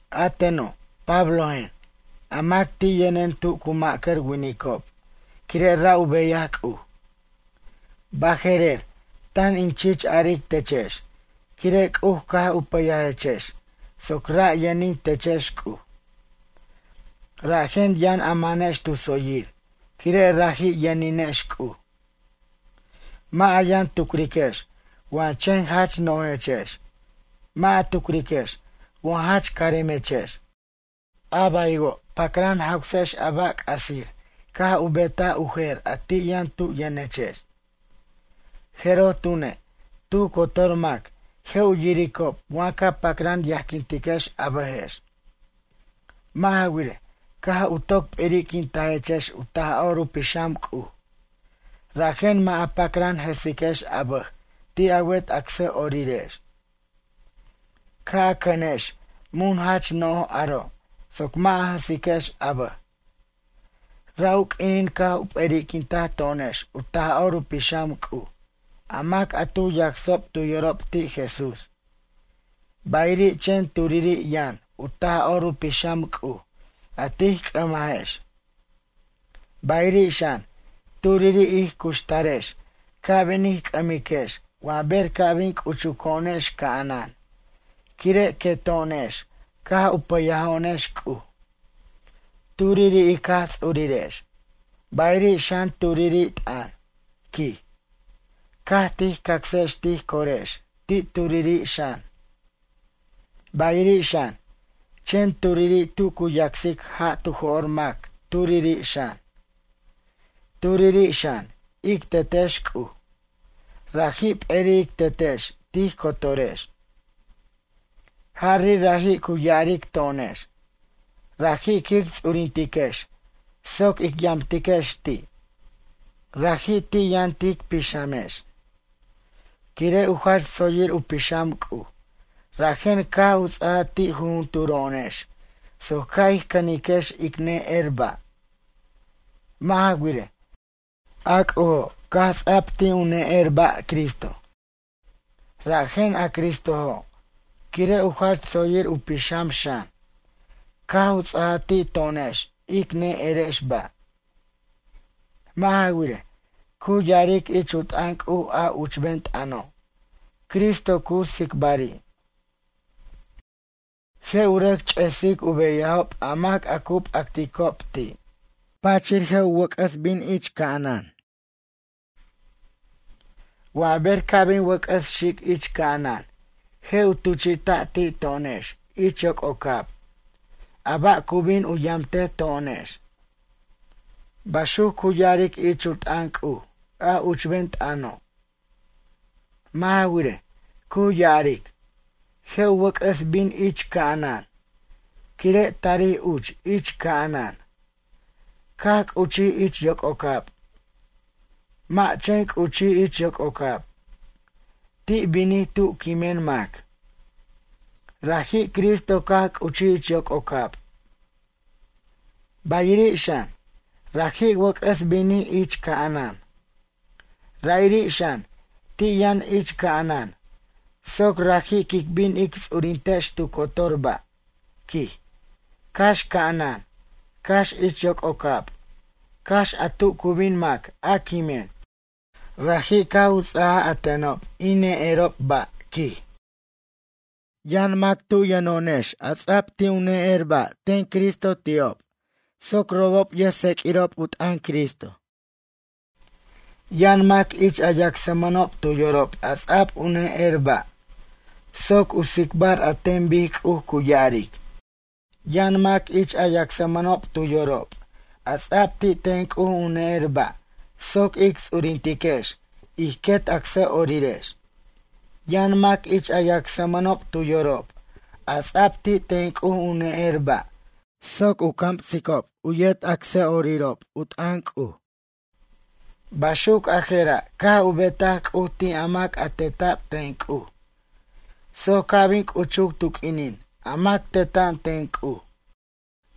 A teno', Pablojen, a mac ti' yʌnen tu cu ma'cʌr winicob quire' ra' u beyaj C'uj. Baje'rer tan in chich aric techex quire' C'uj caj u pʌyajechex soc ra' yʌnin techex C'uj. Rajen yʌn a manex tu tsoyir quire' raji' yʌninex C'uj. Mʌ' a yʌn tucriquex wa chen jach nojechex, mʌ' a tucriquex wa jach caremechex. A baywo' pacran jawsex a ba' c'asir caj betaj u jer a ti' yʌn tu' yʌnechex. Jeroj tune', tu cotor mac je' u yiricob wa ca pacran yajquintiquex a bʌjex. Mʌ' ja wirej, caj u toc p'eri'quintajechex u Taj'or u Pixam C'uj, rajen mʌ' a pacran jʌsiquex a bʌj ti' a wet acsʌ'orirex. Ca' a cʌnex mun jach no'j aro' soc mʌ' a jʌsiquex a bʌj. Ra' u q'uinin caj u p'eri'quintaj to'onex u Taj'or Pixam C'uj a mac a tu yacsob tu yorob ti' Jesús, bayiri' chen turiri' yʌn u Taj'or Pixam C'uj a tij c'ʌmajex. Bayiri' xan, turiri' ij cuxtarex ca' bin ij c'ʌmiquex wa ber ca' bin c'uchuco'onex ca'anan, quire' queto'onex caj u pʌyajo'onex C'uj. Turiri' ic Jaj Ts'urirex, bayiri' xan turiri' t'ʌn, quij, caj tij cacsex tij corex ti' turiri' xan. Bayiri' xan, chen turiri' tu cu yacsic ja' tu jo'r mac turiri' xan. Turiri' xan, ic Tetex C'uj, raji' p'eri' ic Tetex tij cotorex. Jari' raji' cu ya'aric to'onex. Raji' quic ts'urintex soc ic yamtiquex ti'. Raji' ti' yʌn tic pixamex. Quire' u jach tsoyir u pixam C'uj rajen caj u ts'aja ti' jujunturo'onex soc ca' ij cʌniquex ic ne'er ba'. Mʌ' ja wirej, a C'ujo' caj ts'a'b ti' u ne'er ba' Cristo, rajen a Cristojo' quire' u jach tsoyir u pixam xan caj u ts'aja ti' to'onex ic ne'erex ba'. Mʌ' ja wirej, cu ya'aric ich u t'ʌn C'uj a uchben t'ʌno', Cristo cu tsicbari': Je' u rʌc ch'esic u beyajob a mac a cu p'acticob ti', pachir je' u wʌc'ʌs bin ich ca'anan. Wa ber ca' bin wʌc'ʌs xic ich ca'anan je' u tuchi'ta' ti' to'onex ich yoc'ocab a ba' cu bin u yamte to'onex. Baxuc cu ya'aric ich u t'ʌn C'uj, a uchben t'ʌno'. Mʌ' ja wirej, cu ya'aric: “Je' u wʌc'ʌs bin ich ca'anan” quire' tarij uch ich ca'anan, caj c'uchij ich yoc'ocab. Mʌ' chen c'uchij ich yoc'ocab, ti' binij tu quimen mac. Raji' Cristo caj c'uchij ich yoc'ocab. Bayiri' xan, raji' wʌc'ʌs binij ich ca'anan. Ra'iri' xan, ti' yʌn ich ca'anan soc raji' quic bin ic ts'urintex tu cotor ba', quij, cax ca'anan, cax ich yoc'ocab, cax a tu cu bin mac a quimen. Raji' caj u ts'ajaj a tenob in ne'erob ba', quij. Yʌn mac tub yʌno'onex a ts'a'b ti' u ne'er ba' ten Cristo ti'ob soc robob yʌjtseq'uirob u t'ʌn Cristo. Yʌn mac ich a yacsmʌnob tu yorob a ts'a'b u ne'er ba' soc u tsicbar an ten bic C'uj cu ya'aric. Yʌn mac ich a yacsmʌnob tu yorob, a ts'a'b ti' ten C'uj u ne'er ba' soc ic ts'urintiquex u quet acsʌ'orirex. Yʌn mac ich a yacsmʌnob tu yorob, a ts'a'b ti' ten C'uj u ne'er ba' soc u camsicob u yet acsʌ'orirob u t'ʌn C'uj. Baxuc jera' caj u betaj C'uj ti' a mac a teta'b ten C'uj, soc ca' bin c'uchuc tu q'uinin a mac teta'an ten C'uj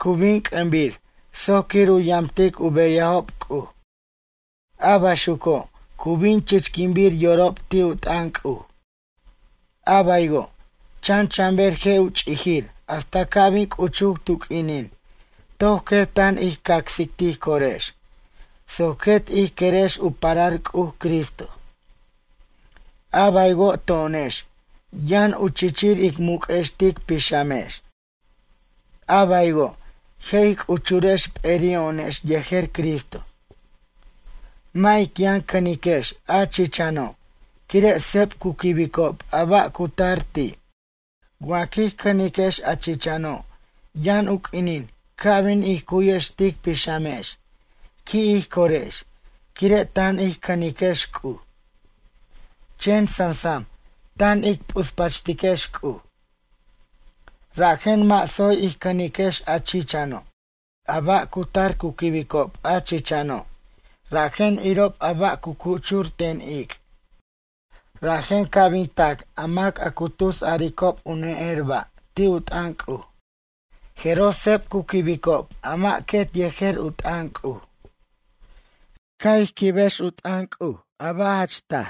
cu bin c'ʌmbir soc quir u yamtic u beyajob C'uj. A baxuco' cu bin chichquinbir yorob ti' u t'ʌn C'uj. A baywo', chan chan ber je' u ch'ijir hasta ca' bin c'uchuc tu q'uinin toc quet tan ij cacsic tij corex, soc quet ij querex u parar C'uj Cristo. A baywo' to'onex yʌn u chichir ic muc'ex tic pixamex, a baywo' je' ij c'uchurex p'eri'o'onex yejer Cristo. Mʌ' ic yʌn cʌniquex a chichano' quire' seb cu quibicob a ba' cu tar ti'. Wa quij cʌniquex a chichano' yʌn u q'uinin ca' bin ij cu'yiquex tic pixamex qui' ij corex quire' tan ij cʌniquex C'uj. Chen sansam tan ic p'uspachtiquex C'uj. Rajen mʌ' tsoy ij cʌniquex a chichano'. A ba' cu tar cu quibicob a chichano' rajen irob a ba' cu cuchur ten ic'. Rajen ca' bin tac a mac a cu tus aricob u ne'er ba' ti' u t'ʌn C'uj. Jeroj seb cu quibicob a mʌ' quet yejer u t'ʌn C'uj. Ca' ij quibiquex u t'ʌn C'uj a ba' jach taj.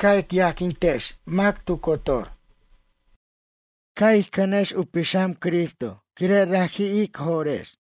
Ca' ic yajquintiquex mac tu cotor. Ca' ij cʌniquex u pixam Cristo quire' raji' ic jo'rex.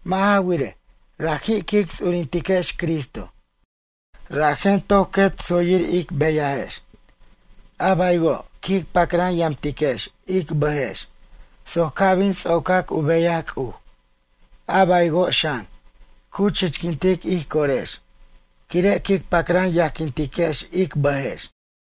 Mʌ' ja wirej, raji' quic ts'urintiquex Cristo. Rajen toc quet tsoyir ic beyajex. A baywo' quic pacran yamtiquex ic bʌjex soc ca' bin ts'ocac u beyaj C'uj. A baywo' xan, cu chichquintic ij corex quire' quic pacran yajquintiquex ic bʌjex.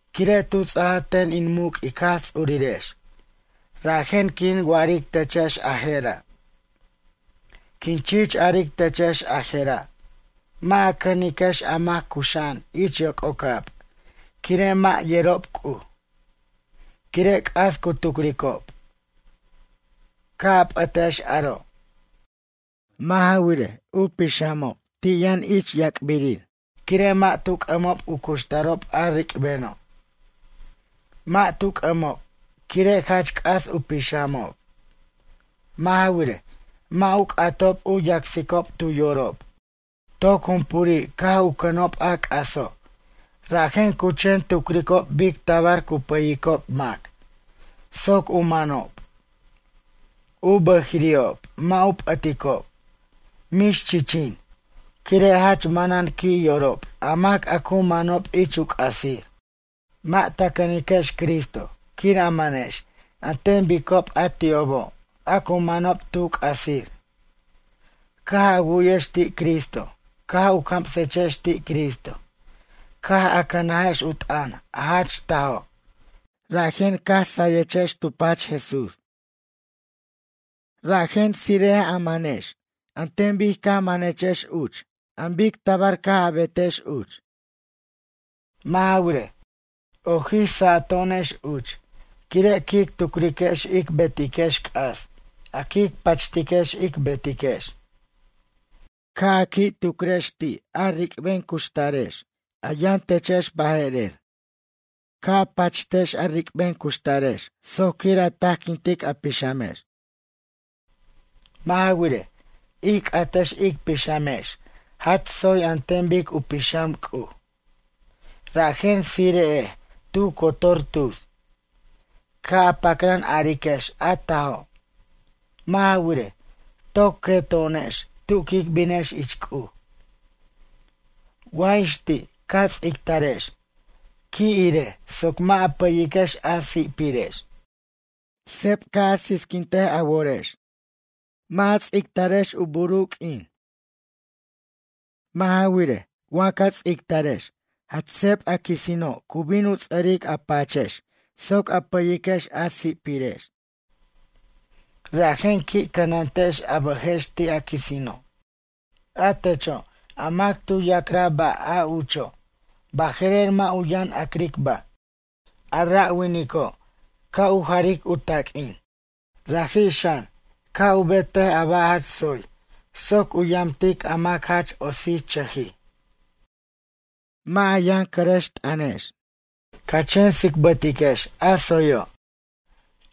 Quire' tu ts'ajaj ten in muc' ic Jaj Ts'urirex, rajen quin wa'aric techex a je'ra'. Quin chich aric techex a je'ra' mʌ' a cʌniquex a mac cuxa'an ich yoc'ocab quire' a mʌ' yerob C'uj, quire' c'as cu tucricob. Ca' a p'ʌtex aro'. Mʌ' ja wirej, u pixamob ti' yʌn ich yac'birir, quire' mʌ' tu c'ʌmob u cuxtarob a ric'beno'. Mʌ' tu c'ʌmob quire' jach c'as u pixamob. Mʌ' ja wirej, mʌ' u c'atob u yacsicob tu yorob. Toc jumpuri' caj u cʌnob a c'aso', rajen cu chen tucricob bic tabar cu pʌyicob mac soc u manob. U bʌjiri'ob mʌ' u p'ʌticob, mix chichin, quire' jach manan qui' yorob a mac a cu manob ich u c'asir. Mʌ' ta cʌniquex Cristo quir a manex an ten bicob a ti'obo' a cu manob tu c'asir. Caj a wu'yex ti' Cristo caj u camsechex ti' Cristo caj a cʌnajex u t'ʌn a jach tajo', rajen caj a sayex tu pach Jesús. Rajen tsire'ej a manex an ten bic caj manechex uch an bic tabar a betex uch. Mʌ' ja wirej, ojij sato'onex uch quire' quic tucriquex ic betiquex c'as a quic pachtiquex ic betiquex. Ca' a qui' tucrex ti' a ric'ben cuxtarex, a yʌn techex baje'rer. Ca' a pachtex a ric'ben cuxtarex soc quir u tajquintic a pixamex. Mʌ' ja wirej, ij c'atex ic pixamex jach tsoy an ten bic u pixam C'uj. Rajen tsire'ej tu cotor tus. Ca' a pacran ariquex a tajo'. Mʌ' ja wirej, toc queto'onex tu quic binex ich C'uj. Wa ix ti' ca ts'ictarex, qui' irej soc mʌ' a pʌyiquex a si'pirex. Seb ca' sisquintic a worex. Mʌ' a ts'ictarex u bur u q'uinin. Mʌ' ja wirej, wa ja ts'ictarex jach seb a quisino' cu bin u ts'ʌric a pachex soc a pʌyiquex a si'pirex. Rajen qui' cʌnantex a bʌjex ti' a quisino'. A techo' a mac tu ya'craj ba' a ucho', baje'rer mʌ' u yʌn a'cric ba'. A ra' winico' ca' u jaric u taq'uin. Raji' xan ca' betej a ba' jach tsoy soc u yamtic a mac jach otsichʌjij. Mʌ' a yʌn cʌrʌxt'ʌnex. Ca chen tsicbatiquex a tsoyo',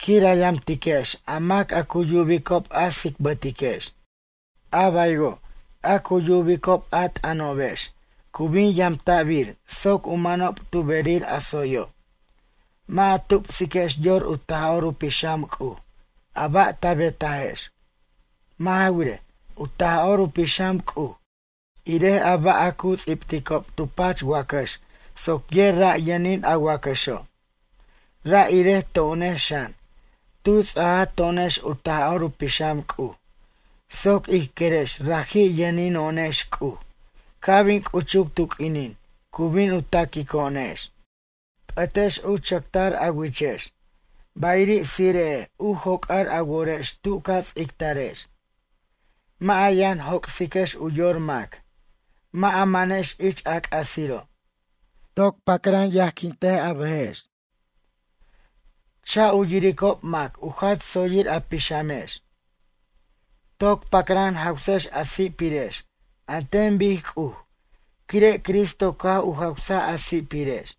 quir a yamtiquex a mac a cu yubicob a tsicbʌtiquex. A baywo' a cu yubicob a t'ʌnobex cu bin yamta'bir soc u manob tu berir a tsoyo'. Mʌ' a tupsiquex yor u Taj'or u Pixam C'uj a ba' ta betajex. Mʌ' ja wirej, u Taj'or u Pixam C'uj irej a ba' a cu ts'ibticob tu pach wacax soc yer ra' yʌnin a wacaxo'. Ra' irej to'onex xan, tu ts'aj to'onex u Taj'or u Pixam C'uj soc ij querex raji' yʌnino'onex C'uj ca' bin c'uchuc tu q'uinin cu bin u taquico'onex. P'ʌtex u chʌctar a wichex, bayiri' tsire'ej u joc'ar a worex tu ca ts'ictarex. Mʌ' a yʌn joc'siquex u yor mac, mʌ' a manex ich a c'asiro'. Toc pacran yajquint a bʌjex. Cha' u yiricob mac u jach tsoyir a pixamex. Toc pacran jawsex a si'pirex an ten bic C'uj quire' Cristo caj u jawsaj a si'pirex.